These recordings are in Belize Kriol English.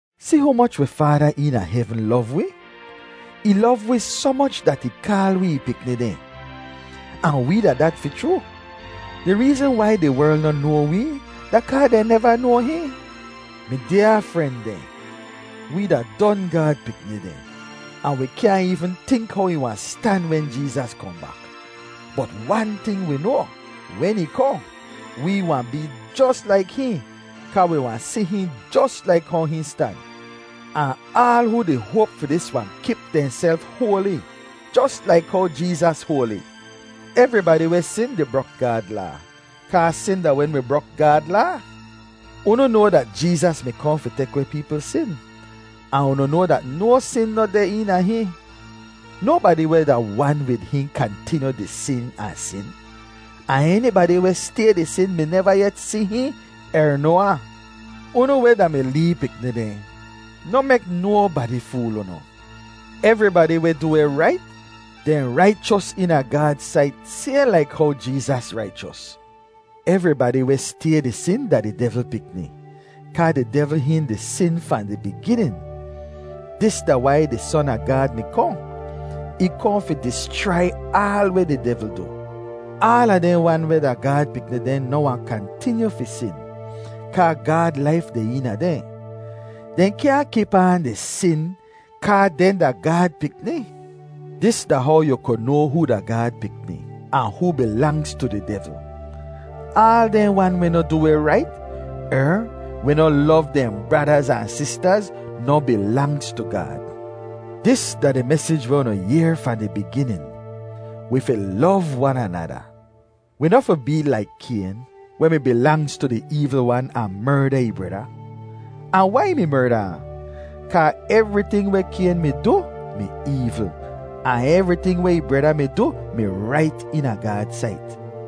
Si humoch wi Faada eena hevn lov wi? Ih lov wi soh moch dat ih kaal wi ih pikni dehn! Ahn wee da dat fi chroo. Di reezn wai di werl noh noa wee da kaa dehn neva noa hihn. Mi dyaa fren dehn, wee da don Gaad pikni dehn, ahn wi kyaahn eevn tink how ih wahn stan wen Jeezas kohn bak. Bot wan ting wi noa, wen ih kohn, wee wahn bee jos laik hihn, kaa wi wahn si hihn jos laik how hihn stan. Ahn aal hoo di hoap fi dis wahn kip dehnself hoali, jos laik how Jeezas hoali. Evribadi weh sin di brok Gaad Laa, kaa sin da wen wi brok Gaad Laa. Unu noa dat Jeezas mi kohn fi tek weh peepl sin, ahn unu noa dat no sin noh deh eena hihn. Nobadi weh da wan wid hihn kantinyu di sin ahn sin; ahn enibadi weh stay di sin mi neva yet si hihn er noa ahn. Unu weh da mi lee pikni dehn, noh mek nobadi fool unu. Evribadi weh du weh rait, dehn raichos eena Gaad sait sayhn laik how Jeezas raichos. Evribadi weh stay di sin da di devl pikni, kaa di devl hihn di sin fahn di biginin. Dis da wai di Son a Gaad mi kohn; ih kohn fi dischrai aal weh di devl du. Aala dehn wan weh da Gaad pikni dehn noh wahn kantinyu fi sin, kaa Gaad laif deh eena dehn. Dehn kyaahn kip aan di sin kaa dehn da Gaad pikni. Dis da how yu ku noa hoo da Gaad pikni, ahn hoo bilangz tu di devl: aal dehn wan weh noh du weh rait, er weh noh lov dehn bradaz ahn sistaz noh bilangz tu Gaad. Dis da di mesij weh unu yehr fahn di biginin: Wi fi lov wan anada. Wi noh fi bee laik Kayn, weh mi bilangz tu di eevl wan ahn merda ih breda. Ahn wai ih mi merda ahn? Kaa evriting weh Kayn mi du mi eevl, ahn evriting weh ih breda mi du mi rait eena Gaad sait.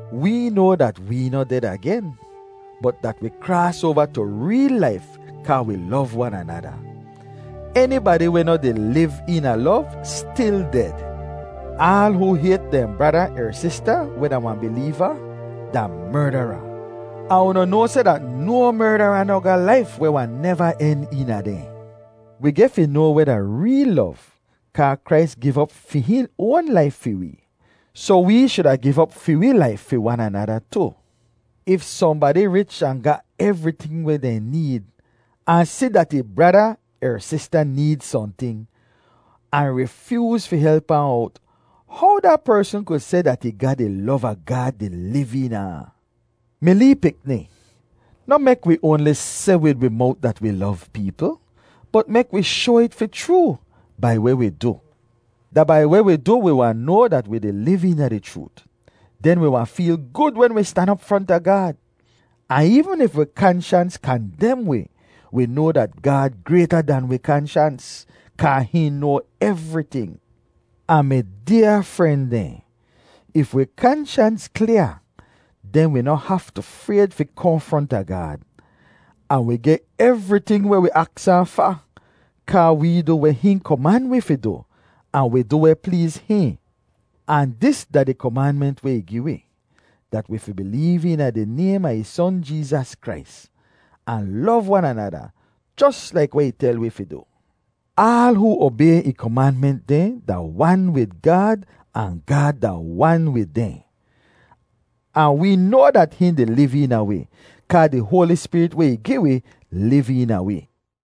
Wee noa dat wee noh ded agen, bot dat wi kraas oava tu reel laif kaa wi lov wan anada. Enibadi weh noh di liv eena lov stil ded. Aal hoo hayt dehn brada er sista weh da wahn bileeva da merdara, ahn unu noa seh dat no merdara noh ga laif weh wahn neva en eena dehn. Wi geh fi noa weh da reel lov, kaa Krais giv op fi hihn oan laif fi wee, soh wee shuda giv op fi wee laif fi wan anada tu. If sohnbadi rich ahn ga evriting weh dehn need, ahn si dat ih brada er sista need sohnting, ahn rifyooz fi help ahn owt, how da persn ku seh dat ih ga di lov a Gaad di liv eena ahn? Mi lee pikni, noh mek wi oanli seh wid wi mowt dat wi lov peepl, bot mek wi shoa it fi chroo bai weh wi du. Da bai weh wi du wi wahn noa dat wi di liv eena di chroot. Den wi wahn feel gud wen wi stan op fronta Gaad. Ahn eevn if wi kanshans kandem wi, wi noa dat Gaad grayta dahn wi kanshans, kaa hihn noa evriting. Ahn mi dyaa fren dehn, if wi kanshans klyaa, den wi noh haftu frayd fi kohn fronta Gaad, ahn wi geh evriting weh wi aks ahn fa, kaa wee du weh hihn koman wi fi du ahn wi du weh pleez hihn. Ahn dis da di komanment weh ih gi wi, dat wi fi bileev eena di naym a ih Son Jeezas Krais, ahn lov wan anada, jos laik weh ih tel wi fi du. Aal hoo obay ih komanment dehn da wan wid Gaad, ahn Gaad da wan wid dehn. Ahn wee noa dat hihn di liv eena wi kaa di Hoali Spirit weh ih gi wi liv eena wi.